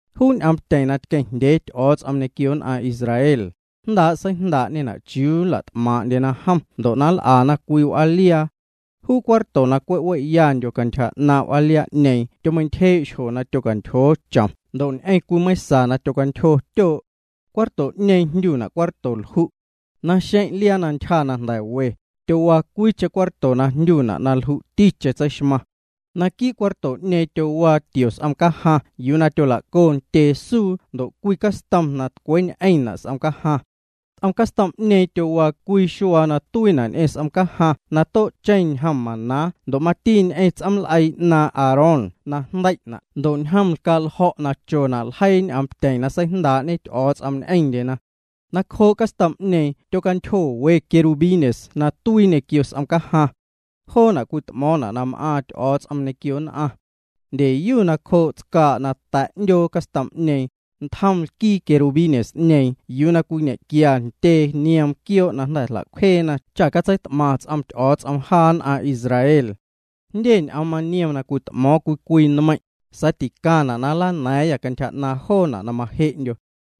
Juu ñ'oomtyeⁿ na tqueⁿjndyee Ty'o̱o̱ts'om ñequio nn'aⁿ Israel, jndaa' seijndaa'ñena' chiuu nla't'maaⁿ'ndyena jom ndo' na nl'ana cwii w'aaliaa. Juu cuarto na cwe' we'yandyo cantyja 'naaⁿ' w'aaliaa'ñeeⁿ tyomeintyjee' xjo na tyocantyjoo chom ndo' ñ'eⁿ cwii meiⁿsa yuu na tyocantyjo ntyoo'. Cuarto'ñeeⁿ jndyuna' Cuarto Lju'. Naxeⁿ' liaa na ntyja na jnda̱ we, tyowaa cwiicheⁿ cuarto na jndyuna' na Lju'ticheⁿ Tseixmaⁿ. Naquii' cuarto'ñeeⁿ tyowaa tio s'om cajaⁿ yuu tyola'co ntyee suu ndo' cwii castom na tcweeñ'eⁿna' s'om cajaⁿ. Ts'om castom'ñeeⁿ tyowaa cwii xuaa na tuiina' ñ'eⁿ s'om cajaⁿ na too'cheⁿ ñjom maná ndo' mati ñ'eⁿ ts'oom l'eii 'naaⁿ' Aarón na jndei'na' ndo' ñjom lcaa' ljo̱' na chona' ljeii ñ'oomtyeⁿ na seijndaa'ñe Ty'o̱o̱ts'om ñ'eⁿndyena. Nacjoo' castom'ñeeⁿ tyocantyjo we querubines na tuii ñequio s'om cajaⁿ. Joona' cwit'mo̱o̱ⁿna' na m'aaⁿ Ty'o̱o̱ts'om ñequio nn'aⁿ. Ndyeyu nacjoo' tscaa' na ta̱' 'ndyoo castom'ñeeⁿ, tjom lquii querubines'ñeeⁿ yuu cwiñequia ntyee nioom quioo' na jnda̱ jla'cwjeena cha catseit'maⁿ ts'om Ty'o̱o̱ts'om jaa nn'aⁿ Israel. Jndye ñ'oom maniom na cwit'mo̱o̱ⁿ cwii cwii nmeiⁿ', sa̱a̱ ticaⁿna' na nlana̱a̱ⁿyâ cantyja 'naaⁿ joona' na maje'ndyo.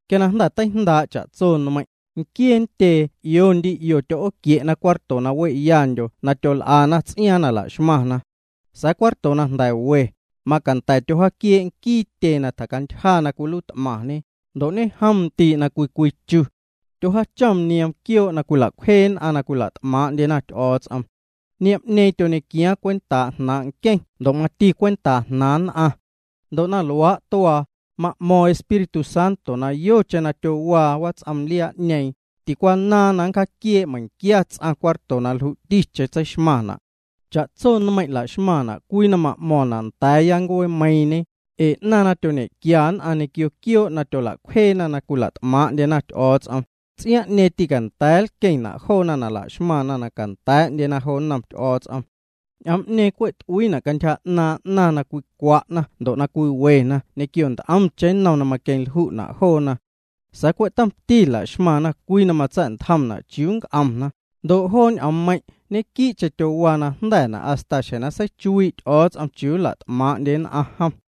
Quia na jnda̱ teijndaa' cha'tso nmeiⁿ', nquiee ntyee 'io ndi 'io tyo'ooquie'na cuarto na we'yandyo na tyol'ana ts'iaaⁿ na la'xmaⁿna. Sa̱a̱ cuarto na jnda̱ we, macanda̱ tyojaaquiee' nquii tyee na tjacantyja cwiluiit'maⁿñe, ndo' ñejom ndii' na cwii cwii chu. Tyojaachom nioom quioo' na cwila'cwjee nn'aⁿ na cwila't'maaⁿ'ndyena Ty'o̱o̱ts'om. Niom'ñeeⁿ tyoñequiaaⁿ cwentaa' jnaaⁿ' nqueⁿ ndo' mati cwentaa jnaaⁿ nn'aⁿ. Ndo' na luaa' tuaa, ma'mo̱ⁿ Espíritu Santo na yocheⁿ na tyowaa wats'om liaa'ñeeⁿ, ticwanaaⁿ na nncjaquiee' meiⁿquia ts'aⁿ cuarto na lju'ticheⁿ tseixmaⁿna'. Cha'tso nmeiⁿ' la'xmaⁿna' cwii na ma'mo̱ⁿna' nda̱a̱ya ncuee meiiⁿñe, ee 'naⁿ na tyoñequia nn'aⁿ ñequio quioo' na tyola'cwjeena na cwila't'maaⁿ'ndyena Ty'o̱o̱ts'om, ts'iaaⁿ'ñeeⁿ tîcanda̱a̱ nlqueⁿna' joona na la'xmaⁿna na canda̱a̱'ndyena jo nnom Ty'o̱o̱ts'om. Ñ'oom'ñeeⁿ cwe' t'uiina' cantyja 'naⁿ na cwicwa'na ndo' na cwiwena ñequio nt'omcheⁿ nnom na maqueⁿlju'na' joona. Sa̱a̱ cwe' tomti la'xmaⁿna' cwii na matsa̱'ntjomna' chiuu na nc'omna, ndo' joo ñ'oommeiⁿ' ñequii'cheⁿ tyowaa najnda̱na' hasta xjeⁿ na seichuii' Ty'o̱o̱ts'om chiuu nla't'maaⁿ'ndye nn'aⁿ jom.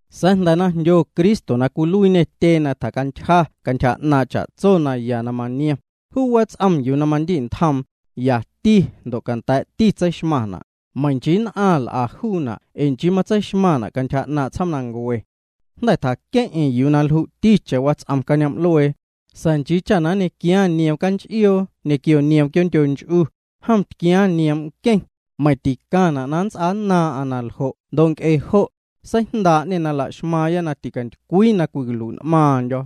Sa̱a̱ jnda̱ jndyo Cristo na cwiluiiñê tyee na tjacantyja cantyja 'naaⁿ' cha'tso naya na maniom. Juu wats'om yuu na mandi'ntjoom, yati ndo' canda̱a̱'ti tseixmaⁿna', meiⁿ nchii nn'aⁿ l'a juuna' ee nchii tseixmaⁿna' cantyja 'naaⁿ' tsjoomnancue. Jnda̱ tjaqueⁿ'eⁿ yuu na lju'ticheⁿ wats'om cañoom'luee, sa̱a̱ nchii cha na nñequiaaⁿ nioom canch'ioo ñequio nioom quioo'ndyo nch'u, jom tquiaaⁿ nioom' nqueⁿ, meiⁿ ticaⁿna' na nnts'aannaaⁿ'aⁿ na ljo' ndo' nc'e jo', seijndaa'ñê na la'xmaaⁿya na ticatycwii na cwicalui'n'maaⁿndyo̱.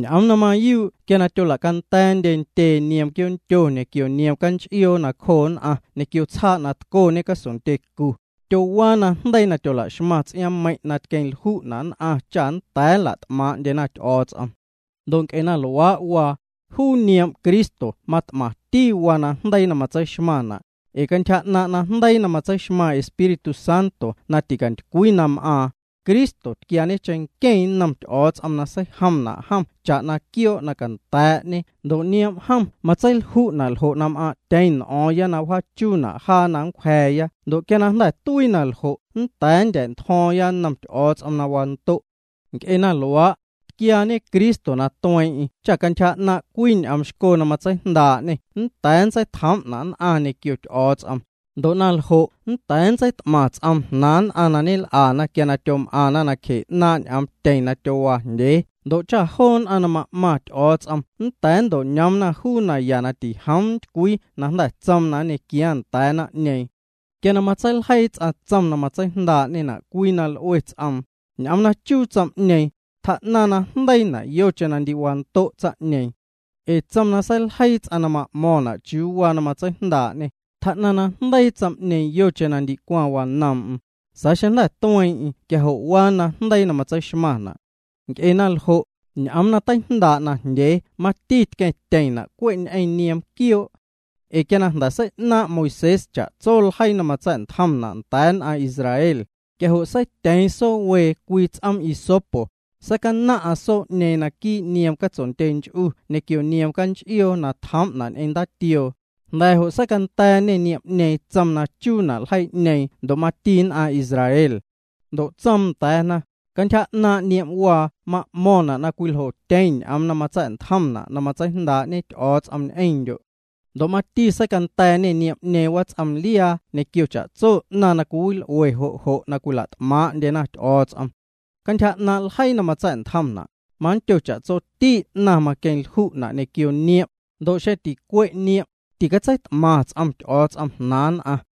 Ñ'oom na mayuu' quia tyolacanda̱a̱ndye ntyee nioom quioo'ndyo ñequio nioom canch'ioo nacjoo nn'aⁿ ñequio tsjaa' na tcoñe casondyecu, tyowaa najndeii na tyola'xmaⁿ ts'iaaⁿmeiⁿ' na tqueⁿ lju'na' nn'aⁿ cha nnda̱a̱ nla't'maaⁿ'ndyena Ty'o̱o̱ts'om. Ndo' nc'e na luaa' waa, juu nioom' Cristo mat'maⁿti waa najndeii na matseixmaⁿna', ee cantyja 'naaⁿ' najndeii na matseixmaⁿ Espíritu Santo na ticantycwii na m'aaⁿ, Cristo tquiaañe cheⁿnqueⁿ nnom Ty'o̱o̱ts'om na seijomna' jom cha'na quioo' na canda̱a̱'ñe ndo' nioom' jom matseilju'na' na m'aaⁿ'tyeⁿ n'o̱o̱ⁿya cantyja 'naaⁿ' joo ts'iaaⁿ na wjaachuuna' jaa na nncwja̱a̱ya cha nnda̱a̱ nndya̱'ntjo̱o̱ⁿya nnom Ty'o̱o̱ts'om na wando'. Nc'e na luaa', tquiaañe Cristo na tueeⁿ'eⁿ cha cantyja 'naaⁿ' cwii ñ'oom xco na matseijndaa'ñê nnda̱a̱ nntseitjoom nn'aⁿ ñequio Ty'o̱o̱ts'om, ndo' na ljo' nnda̱a̱ nntseit'maⁿ ts'oom nn'aⁿ jnaaⁿna na ñel'ana quia tyom'aⁿna nacje 'naaⁿ' ñ'oomtyeⁿ na tyowaajndyee ndo' cha joo nn'aⁿ na ma'maⁿ Ty'o̱o̱ts'om nnda̱a̱ nnto'ñoomna juu naya na tijoom ntycwii na jnda̱ tsoom na nñequiaaⁿ nda̱a̱ naⁿ'ñeeⁿ. Quia matseiljeii ts'aⁿ tsom na matseijndaa'ñena' cwii na l'ue ts'om, ñ'oom na chuu tsom'ñeeⁿ, tjaa'naⁿ najndeiina' yocheⁿ na ndicwaⁿ wando' tsaⁿ'ñeeⁿ. Ee tsom na seiljeii ts'aⁿ na ma'mo̱ⁿna' chiuu waa na matseijndaa'ñe, tjaa'naⁿ najndeii tsom'ñeeⁿ yocheⁿ na wando' tsaⁿ'ñeeⁿ, xeⁿ jnda̱ tueeⁿ'eⁿ quia jo' waa najndeii na matseixmaⁿna'. Nc'e na ljo', ñ'oom na teijndaa' najndyee mati tqueⁿtyeⁿna' cwe' ñ'eⁿ nioom quioo'. Ee quia na jnda̱ sei'naaⁿ' Moisés cha'tso ljeii na matsa̱'ntjomna' nda̱a̱ nn'aⁿ Israel, quia jo' seityeeⁿ soo wee cwii ts'oom hisopo, seicanaⁿ'aⁿ soo'ñeeⁿ quii' nioom catsondyench'u ñequio nioom canch'ioo na tjoom'na' ñ'eⁿ ndaatioo, jnda̱ jo' seicanda̱a̱ñê niom'ñeeⁿ tsom na chuu ljeii'ñeeⁿ ndo' mati nn'aⁿ Israel. Ndo' tsoom nda̱a̱na: “Cantyja 'naaⁿ' niom'waa ma'mo̱ⁿna' na cwiljotyeⁿ ñ'oom na matsa̱'ntjomna' na matseijndaa'ñe Ty'o̱o̱ts'om ñ'eⁿndyo'.” Ndo' mati seicanda̱a̱ñê niom'ñeeⁿ wats'omliaa ñequio cha'tso 'naⁿ na cwiwil'ue jo' jo' na cwila't'maaⁿ'ndyena Ty'o̱o̱ts'om. Cantyja 'naaⁿ' ljeii na matsa̱'ntjomna', mandyo na cha'tsoti 'naⁿ maqueⁿlju'na' ñequio niom', ndo' xeⁿ ticwe' niom', ticatseit'maⁿ ts'om Ty'o̱o̱ts'om jnaaⁿ nn'aⁿ.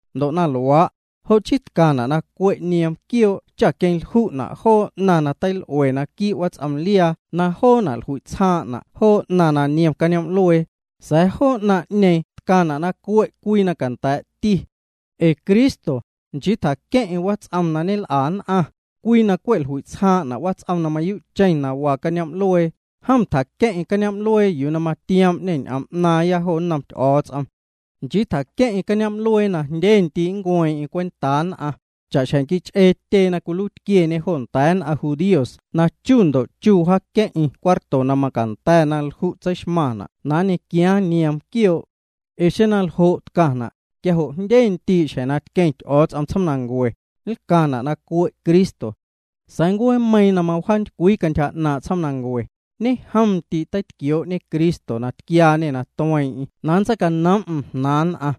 Ndo' na luaa', jo' chii tcaⁿna' na cwe' nioom quioo' cha queⁿlju'na' joo 'naⁿ na teil'ue quii' wats'omliaa na joona' jlui'tsjaaⁿ'na' joo 'naⁿ na niom cañoom'luee, sa̱a̱ joo 'naⁿ'ñeeⁿ tcaⁿna' na cue' cwii na canda̱a̱'ti. Ee Cristo, nchii tjaqueⁿ'eⁿ wats'om na ñel'a nn'aⁿ, cwii na cwe' jlui'tsjaaⁿ'na' wats'om na mayuu'cheⁿ na waa cañoom'luee. Jom tjaqueⁿ'eⁿ cañoom'luee yuu na matioom'ñê ñ'oom 'naaⁿya jo nnom Ty'o̱o̱ts'om. Nchii tjaqueⁿ'eⁿ cañoom'luee na jndye ndii' na nncueeⁿ'eⁿ cwentaa nn'aⁿ, cha'xjeⁿ quich'ee tyee na cwiluiitquieñe jo nda̱a̱ nn'aⁿ judíos na chu ndo' chu mawjaaqueⁿ'eⁿ cuarto na macanda̱ na lju' tseixmaⁿna' na nñequiaaⁿ nioom quioo'. Ee xeⁿ na ljo' tcaⁿna', quia jo' jndye ndii' xjeⁿ na tqueⁿ Ty'o̱o̱ts'om tsjoomnancue, nlcaⁿna' na cue' Cristo. Sa̱a̱ ncueemeiiⁿ na mawjaantycwii cantyja 'naaⁿ' tsjoomnancue, ñejomndii' teitquioo'ñe Cristo, na tquiaañê na tueeⁿ'eⁿ na nntseicanoom'm jnaaⁿ nn'aⁿ.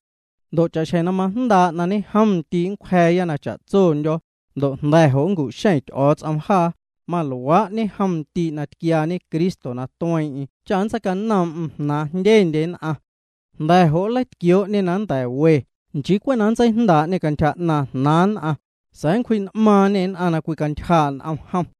Ndo' cha'xjeⁿ na majndaa' na ñejom ndii' nncwja̱a̱ya na cha'tsondyo̱, ndo' jnda̱ jo' nncu'xeⁿ Ty'o̱o̱ts'om jaa, maluaa' ñejomndii' na tquiaañe Cristo na tueeⁿ'eⁿ cha nntseinoom'm jnaaⁿ jndyendye nn'aⁿ. Nda̱ jo' nleitquioo'ñê na nnda̱ we, nchii cwe' na nntseijndaa'ñê cantyja 'naaⁿ jnaaⁿ nn'aⁿ, sa̱a̱ na nncwji'n'maaⁿñê nn'aⁿ na cwicantyjaa' n'om jom.